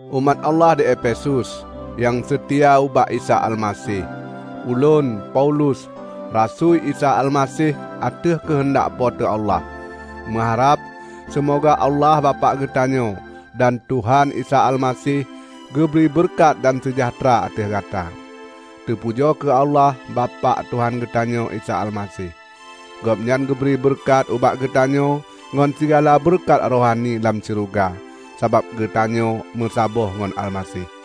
Umat Allah di Efesus, nyang seutia ubak Isa Almaseh! Ulôn, Paulus, rasui Isa Almaseh ateueh keuheundak Po teu Allah, meuharab seumoga Allah Bapak geutanyoe dan Tuhan Isa Almaseh geubri beureukat dan seujahteura ateueh gata. Teupujoe kheueh Allah, Bapak Tuhan geutanyoe Isa Almaseh! Gobnyan geubri beureukat ubak geutanyoe ngon sigala beureukat rohani lam syeuruga, sabab geutanyoe meusaboh ngon Almaseh.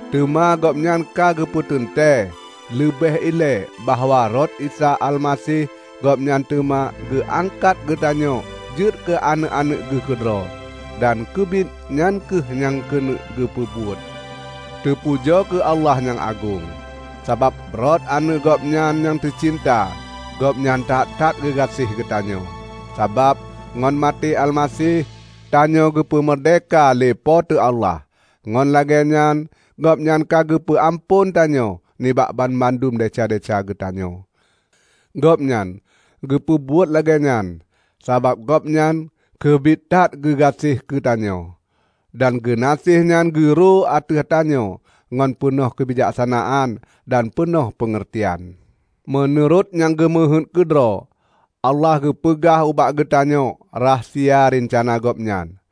teuma Gobnyan ka geupeuteuntée leubeh ilée bahwa rot Isa Almaseh, Gobnyan teuma geu angkat geutanyoe jeuet keu aneuëk-aneuëk geuh keudroe. Dan keubiet nyan kheueh nyang keuneuk geupeubuet. Teupujoe kheueh Allah nyang agong, sabab rot Aneuëk Gobnyan nyang teucinta Gobnyan that-that geugaséh geutanyoe. Sabab, ngon maté Almaseh, tanyoe geupeu meurdehka lé Po teu Allah, ngon lagée nyan Gobnyan ka geupeu amphon tanyoe nibak banmandum desya-desya geutanyoe. Gobnyan geupeubuet lagée nyan sabab Gobnyan keubiet that geugaséh keutanyoe, dan geunaséh nyan geurô ateueh tanyoe ngon peunoh keubijaksanaan dan peunoh peungeurtian. Meunurot nyang geumeuhéuet keudroe, Allah geupeugah ubak geutanyoe rahsia reuncana Gobnyan;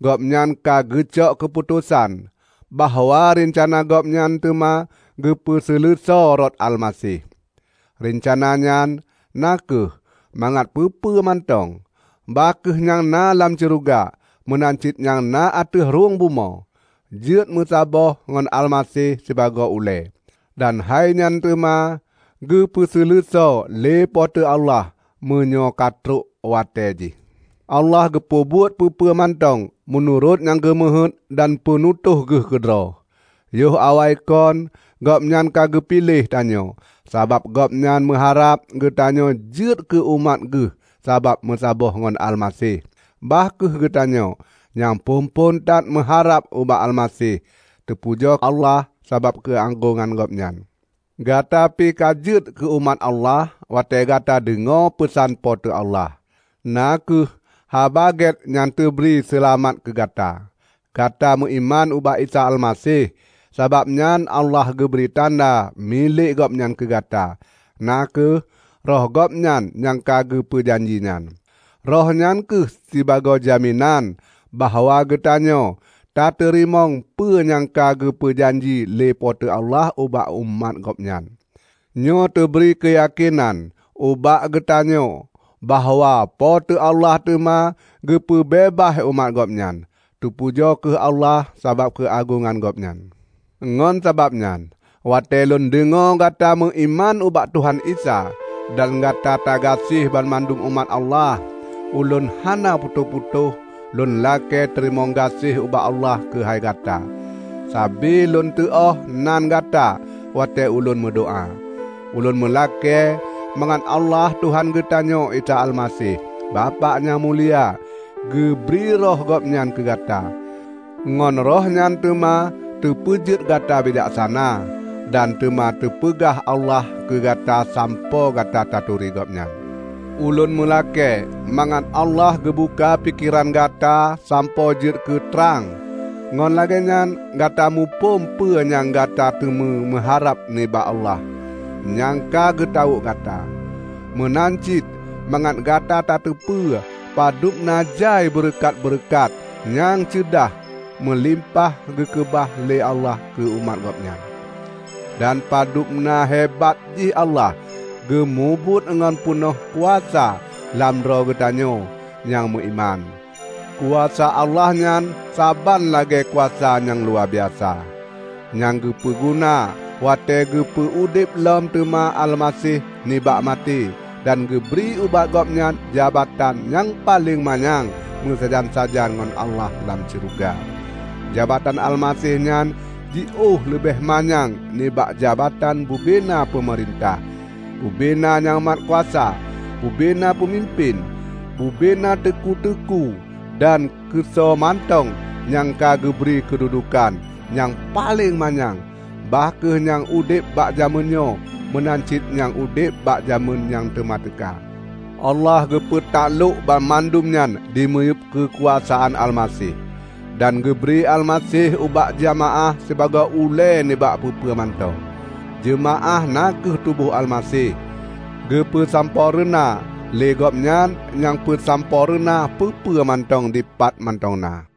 Gobnyan ka geucok keuputosan bahwa reuncana Gobnyan teuma geupeuseuleusoe rot Almaseh. Reuncana nyan na kheueh mangat peue-peue mantong, bah kheueh nyang na lam syeuruga meunan cit nyang na ateueh rhueng bumoe, jeuet meusaboh ngon Almaseh sibagoe ulée. Dan hainyan teuma geupeuseuleusoe lé Po teu Allah meunyoe ka trok watée jih. Allah geupeubuet peue-peue mantong meunurot nyang geumeuhéuet dan peunutôh geuh keudroe. Yoh awaikon Gobnyan ka geupiléh tanyoe sabab Gobnyan meuharab geutanyoe jeuet keu umat geuh sabab meusaboh ngon Almaseh. Bah kheueh geutanyoe, nyang phon-phon that meuharab ubak Almaseh, tapujoe Allah sabab keuagongan Gobnyan! Gata pi ka jeuet keu umat Allah watée gata deungoe peusan Po teu Allah, na kheueh Haba Gét nyang teubri seulamat keugata. Gata meuiman ubak Isa Almaseh, sabab nyan Allah geubri tanda milék Gobnyan keugata, na kheueh Roh Gobnyan nyang ka geupeu janji nyan. Roh nyan kheueh sibagoe jaminan bahwa geutanyoe tateurimong peue nyang ka geupeu janji lé Po teu Allah ubak umat Gobnyan. Nyoe teubri keuyakénan ubak geutanyoe bahwa Po teu Allah teuma geupeubeubaih umat Gobnyan. Teupujoe kheueh Allah sabab keuagongan Gobnyan! Ngon sabab nyan, watée lôn deungoe gata meuiman ubak Tuhan Isa, dan gata tagaséh banmandum umat Allah, ulôn hana putôh-putôh lôn lakée teurimong gaséh ubak Allah keuhai gata. Sabe lôn teuôh nan gata watée ulôn meudoá. Ulôn meulakée mangat Allah Tuhan geutanyoe Isa Almaseh, Bapak nyang mulia, geubri Roh Gobnyan keugata. Ngon Roh nyan teuma teupeujeuet gata bijaksana, dan teuma teupeugah Allah keu gata sampoe gata taturi Gobnyan. Ulôn meulakée mangat Allah geubuka pikeran gata sampoe jeuet keu trang; ngon lagée nyan gata muphom peue nyang gata teumé meuharab nibak Allah nyang ka geutawök gata. Meunan cit mangat gata tateupeue padub na jai beureukat-beureukat nyang ceudah meulimpah geukeubah lé Allah keu umat Gobnyan; dan padub na hebat jih Allah geumubuet ngon peunoh kuasa lam droe geutanyoe nyang meuiman. Kuasa Allah nyan saban lagée kuasa nyang luwabiasa nyang geupeu guna watée geupeu udeb lom teuma Almaseh nibak maté dan geubri ubak Gobnyan jabatan nyang paleng manyang meusajan-sajan ngon Allah lam syeuruga. Jabatan Almaseh nyan jiôh leubeh manyang nibak jabatan bubena peumeurintah, bubena nyang mat kuasa, bubena peumimpén, bubena teuku-teuku dan keusoe mantong nyang ka geubri keududuekan nyang paleng manyang; bah kheueh nyang udeb bak jamén nyoe meunan cit nyang udeb bak jamén nyang teuma teuka. Allah geupeu taklok banmandum nyan dimiyueb keukuasaan Almaseh, dan geubri Almaseh ubak jeumaáh sibagoe ulée nibak peue-peue mantong. Jeumaáh na kheueh tuboh Almaseh, geupeue sampoereuna lé Gobnyan nyang peusampoereuna peue-peue mantong dipat mantong na.